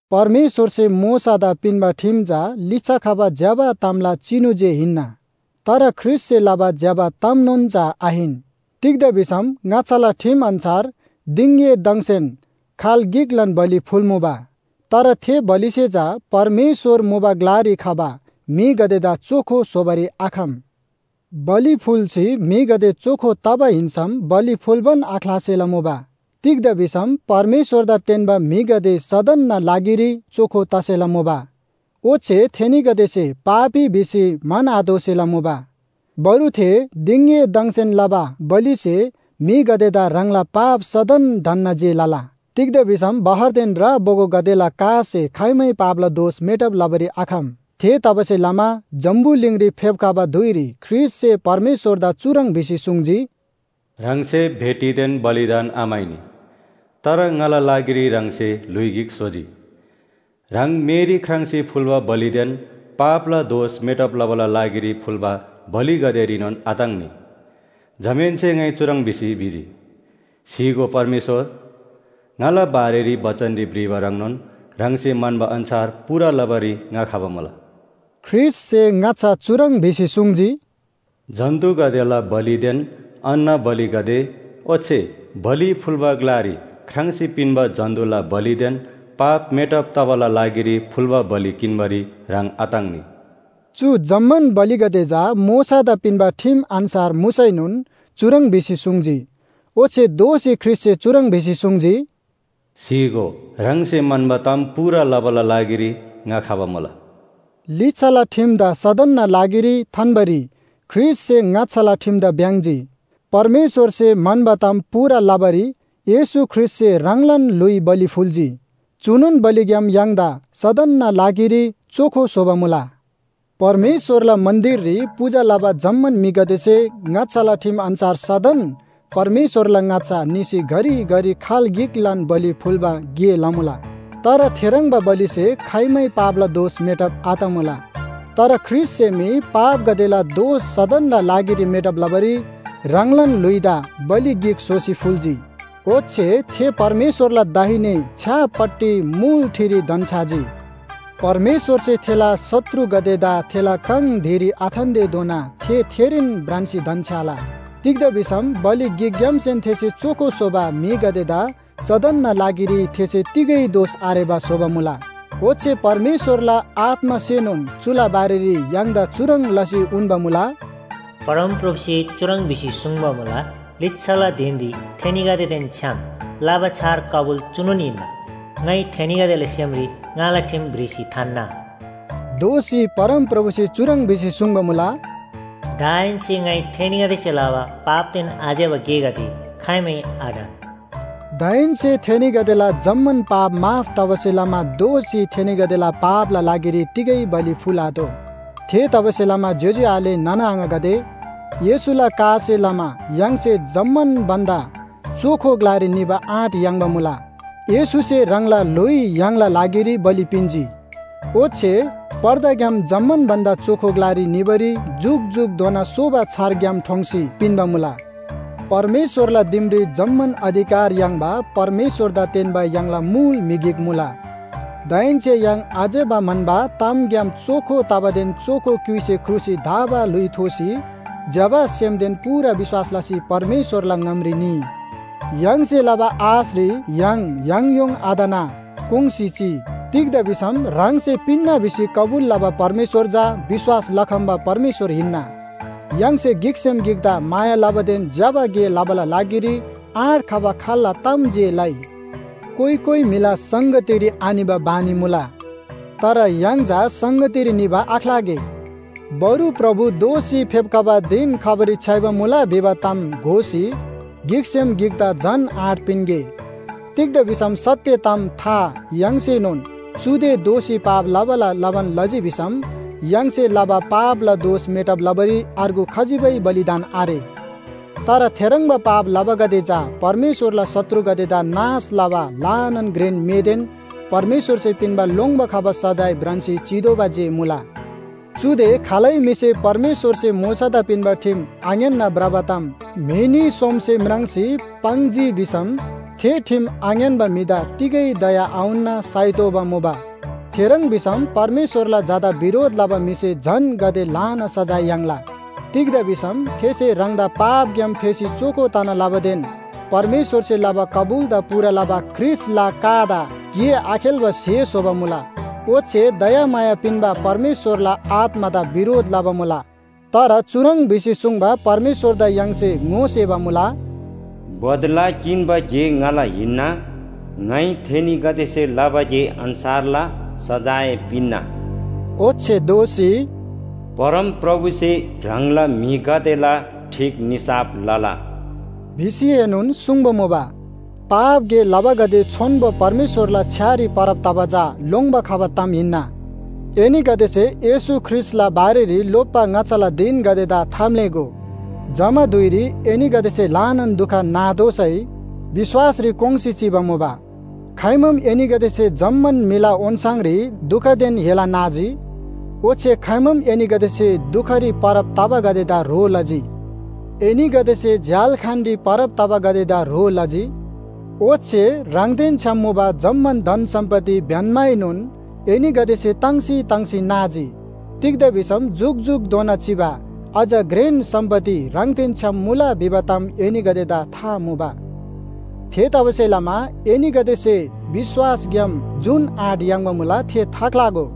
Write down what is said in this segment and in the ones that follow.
परमेश्‍वरसे मोशादा पिन्‍बा ठिम चा लिच्‍छा खबा ज्‍यबा तामला चिनु जे हिन्‍ना। तर ख्रीष्‍टसे लबा ज्‍यबा तामनोन चा आहिन। तिग्‍दा भिसम ङाच्‍छाला ठिम अन्‍छार दिङएदङसेन खाल गिकलान बलि फुल्‍मुबा। तर थे बलिसे चा परमेश्‍वर मुबा ग्‍लारी खबा म्‍हिगदेदा चोखो स्‍होबारी आखम। बलि फुल्‍सी म्‍हिगदे चोखो तबा हिन्‍सम बलि फुल्‍बान आख्‍लासेला मुबा। तिग्‍दा भिसम परमेश्‍वरदा तेन्‍बा म्‍हिगदे सदनना लागिरी चोखो तसेला मुबा। ओच्‍छे थेनीगदेसे पापी भिसी म्‍हन्‍आतोःसेला मुबा। बरु थे दिङएदङसेन लबा बलिसे म्‍हिगदेदा ह्राङला पाप सदन ढन्‍ना जे लला। तिग्‍दा भिसम बहरदेन रा बोगोगदेला कासे खाइमै पापला दोष मेटब लबारी आखम। थेतबासेलमा जम्‍बुलिङरी फेप्‍खबा धुइरी ख्रीष्‍टसे परमेश्‍वरदा चुह्रङ् भिसी सुङ्जी, “‘ह्राङसे भेटीदेन बलिदान आम्‍हाइनी, तर ङाला लागिरी ह्राङसे ल्‍हुइ गिक स्‍होजी। ह्राङ मेरी ख्राङ्‌सी फुल्‍बा बलिदेन पापला दोष मेटब तबाला लागिरी फुल्‍बा बलिगदेरीनोन आताङ्‌नी।’ जमाहेन्‍से ङाइ चुह्रङ् भिसी भिजी, ‘स्‍हीगो परमेश्‍वर, ङाला बारेरी बचनरी भ्रिबा ह्रङ्नोन ह्राङसे म्‍हन्‍बा अन्‍छार पूरा लबारी ङा खबा मुला।’” ख्रीष्‍टसे ङाच्‍छा चुह्रङ् भिसी सुङ्जी, “जन्‍तुगदेला बलिदेन अन्‍न बलिगदे ओच्‍छे बलि फुल्‍बा ग्‍लारी ख्राङ्‌सी पिन्‍बा जन्‍तुला बलिदेन पाप मेटब तबाला लागिरी फुल्‍बा बलि किन्‍बारी ह्राङ आताङ्‌नी।” चु जम्‍मान बलिगदे चा मोशादा पिन्‍बा ठिम अन्‍छार मुसैनोन चुह्रङ् भिसी सुङ्जी। ओच्‍छे दोःसी ख्रीष्‍टसे चुह्रङ् भिसी सुङ्जी, “स्‍हीगो, ह्राङसे म्‍हन्‍बा ताम पूरा लबाला लागिरी ङा खबा मुला।” लिच्‍छाला ठिमदा सदनना लागिरी थान्‍बारी ख्रीष्‍टसे ङाच्‍छाला ठिमदा भ्‍याङ्‍जी। परमेश्‍वरसे म्‍हन्‍बा ताम पूरा लबारी येशू ख्रीष्‍टसे ह्राङलान ल्‍हुइ बलि फुल्‍जी। चुनोन बलिग्‍याम य्‍हाङदा सदनना लागिरी चोखो स्‍होबा मुला। परमेश्‍वरला मन्‍दिररी पूजा लबा जम्‍मान म्‍हिगदेसे ङाच्‍छाला ठिम अन्‍छार सदन परमेश्‍वरला ङाच्‍छा निसी घरिघरि खाल गिकलान बलि फुल्‍बा गे लमुला। तर थेह्रङ्बा बलिसे खाइमै पापला दोष मेटब आतमुला। तर ख्रीष्‍टसे मी पापगदेला दोष सदनना लागिरी मेटब लबारी ह्राङलान ल्‍हुइदा बलि गिक स्‍होसी फुल्‍जी। ओच्‍छे थे परमेश्‍वरला दाहिने छ्‌यापट्टि मुल ठिरी धन्‍छ्‌याजी। परमेश्‍वरसे थेला शत्रुगदेदा थेला काङ धिरी आथान्‍तेधोना थे थेरीन भ्रान्‍सी धन्‍छ्‌याला। तिग्‍दा भिसम बलि गिकग्‍यामसेन थेसे चोखो स्‍होबा म्‍हिगदेदा सदनना लागिरी थेसे तिगै दोष आरेबा स्‍होबा मुला। ओच्‍छे परमेश्‍वरला आत्‍मासेनोन चुला बारेरी य्‍हाङदा चुह्रङ् लसी उन्‍बा मुला, “परमप्रभुसे चुह्रङ् भिसी सुङ्बा मुला, लिच्‍छाला धिनरी थेनीगदेदेन छ्‌याम लबा छार कबुल चुनोन हिन्‍ना। ङाइ थेनीगदेला सेमरी ङाला ठिम भ्रिसी थान्‍ना।” दोःसी परमप्रभुसे चुह्रङ् भिसी सुङ्बा मुला, “दाहेन्‍से ङाइ थेनीगदेसे लबा पापदेन आज्‍यबा गेगदे खाइमै आढन।” दाहेन्‍से थेनीगदेला जम्‍मान पाप माफ तबासे लमा दोःसी थेनीगदेला पापला लागिरी तिगै बलि फुल्‍आतोः। थेतबासेलमा ज्‍योज्‍यो आले नाना आङागदे, येशूला कासे लमा य्‍हाङसे जम्‍मान भन्‍दा चोखो ग्‍लारी निबा आँट याङ्बा मुला। येशूसे ह्राङला ल्‍हुइ य्‍हाङला लागिरी बलि पिन्‍जी। ओच्‍छे पर्दाग्‍याम जम्‍मान भन्‍दा चोखो ग्‍लारी निबारी जुकजुकधोना सोबा छार ग्‍याम ठोङ्सी पिन्‍बा मुला। परमेश्‍वरला दिमरी जम्‍मान अधिकार याङ्बा परमेश्‍वरदा तेन्‍बा य्‍हाङला मुल म्‍हि गिक मुला। दाहेन्‍से य्‍हाङ आज्‍यबा म्‍हन्‍बा तामग्‍याम चोखो तबादेन चोखो क्‍युइसे ख्रुसी धा‍बा ल्‍हुइ थोसी ज्‍यबा सेमदेन पूरा विश्‍वास लसी परमेश्‍वरला ङामरी निइ। य्‍हाङसे लबा आशरी य्‍हाङ याङयोङ आतना कोङ्‌सी चिइ। तिग्‍दा भिसम ह्राङसे पिन्‍ना भिसी कबुल लबा परमेश्‍वर चा विश्‍वास लखम्‍बा परमेश्‍वर हिन्‍ना। य्‍हाङसे गिकसेम गिकदा माया लबादेन ज्‍यबा गे लबाला लागिरी आँट खबा खाल्‍ला ताम जे लइ। कोइ कोइ म्‍हिला संगतीरी आनिबा बानी मुला। तर य्‍हाङ चा संगतीरी निबा आख्‍लागे। बरु प्रभु दोःसी फेप्‍खबा धिन खबारी छ्‌याइबा मुला भिबा ताम घोसी गिकसेम गिकदा झन आँट पिन्‍गे। तिग्‍दा भिसम सत्‍य ताम था याङ्सीनोन चुदे दोःसी पाप लबाला लबान लजी भिसम य्‍हाङसे लबा पापला दोष मेटब लबारी अर्गु खजिबै बलिदान आरे। तर थेह्रङ्बा पाप लबागदे चा परमेश्‍वरला शत्रुगदेदा नाश लबा ल्‍हानान घ्रेन मेदेन परमेश्‍वरसे पिन्‍बा लोङ्‌बा खबा सजाय भ्रान्‍सी चितोःबा जे मुला। चुदे खालै म्‍हिसे परमेश्‍वरसे मोशादा पिन्‍बा ठिम आङ्‌यान्‍ना भ्रबा ताम म्‍हि न्‍ही सोमसे म्राङ्सी पाङ्जी भिसम थे ठिम आङ्‌यान्‍बा म्‍हिदा तिगै दया आउन्‍ना साइतोःबा मुबा। थेह्रङ् भिसम परमेश्‍वरला झादा बिरोध लबा म्‍हिसे झन गाते ल्‍हाना सजाय याङ्ला। तिग्‍दा भिसम थेसे ह्राङदा पापग्‍याम फेसी चोखो तना लबादेन परमेश्‍वरसे लबा कबुलदा पूरा लबा ख्रीष्‍टला कादा गे आखेल्‍बा स्‍हे स्‍होबा मुला, ओच्‍छे दयामाया पिन्‍बा परमेश्‍वरला आत्‍मादा बिरोध लबा मुला। तर चुह्रङ् भिसी सुङ्बा परमेश्‍वरदा य्‍हाङसे ङोसेबा मुला, “बदला किन्‍बा गे ङाला हिन्‍ना, ङाइ थेनीगदेसे लबा गे अन्‍छारला सजाय पिन्‍ना”। ओच्‍छे दोःसी, “परमप्रभुसे ह्राङला म्‍हिगदेला ठीक निसाफ लला” भिसीएनोन सुङ्बा मुबा। पाप गे लबागदे छोन्‍बो परमेश्‍वरला छ्‌यारी परब तबा चा लोङ्‌बा खबा ताम हिन्‍ना। एनीगदेसे येशू ख्रीष्‍टला बारेरी लोप्‍बा ङाच्‍छाला धिनगदेदा थाम्‍लेःगो। जमा धुइरी एनीगदेसे ल्‍हानान दुख नातोःसै विश्‍वासरी कोङ्‌सी चिबा मुबा। खाइमाम एनीगदेसे जम्‍मान म्‍हिला ओन्‍छाङरी दुखदेन हेला नाजी। ओच्‍छे खाइमाम एनीगदेसे दुखरी परब तबागदेदा ह्रो लजी। एनीगदेसे झ्‍याल्‍खानरी परब तबागदेदा ह्रो लजी। ओच्‍छे ह्राङदेन छ्‌याम मुबा जम्‍मान धन सम्‍पत्ति ब्‍यन्‍माएनोन एनीगदेसे ताङ्सी ताङ्सी नाजी। तिग्‍दा भिसम जुकजुकधोना चिबा अझ घ्रेन सम्‍पत्ति ह्राङदेन छ्‌याम मुला भिबा ताम एनीगदेदा था मुबा। थेतबासेलमा एनीगदेसे विश्‍वासग्‍याम जुन आँट याङ्बा मुला थे थाख्‍लागो।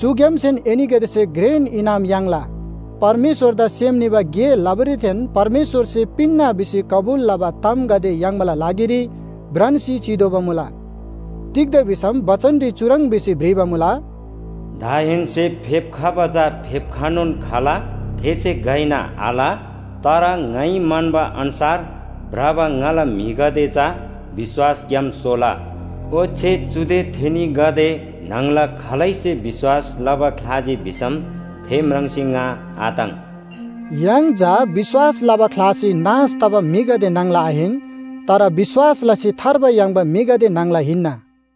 चुग्‍यामसेन एनीगदेसे घ्रेन इनाम याङ्ला। परमेश्‍वरदा सेम निबा गे लबारीदेन परमेश्‍वरसे पिन्‍ना भिसी कबुल लबा तामगदे याङ्बाला लागिरी भ्रान्‍सी चितोःबा मुला। तिग्‍दा भिसम बचनरी चुह्रङ् भिसी भ्रिबा मुला, “दाहेन्‍से फेप्‍खबा चा फेप्‍खनोन खला, थेसे घइना आल। तर ङाइ म्‍हन्‍बा अन्‍छार भ्रबा ङाला म्‍हिगदे चा विश्‍वासग्‍याम सोला, ओच्‍छे चुदे थेनीगदे न्‍हङला खालैसे विश्‍वास लबा ख्‍लाजी भिसम थे म्राङ्सी ङा आताङ्।” य्‍हाङ चा विश्‍वास लबा ख्‍लासी नाश तबा म्‍हिगदे न्‍हङला आहिन, तर विश्‍वास लसी थार्बा याङ्बा म्‍हिगदे न्‍हङला हिन्‍ना।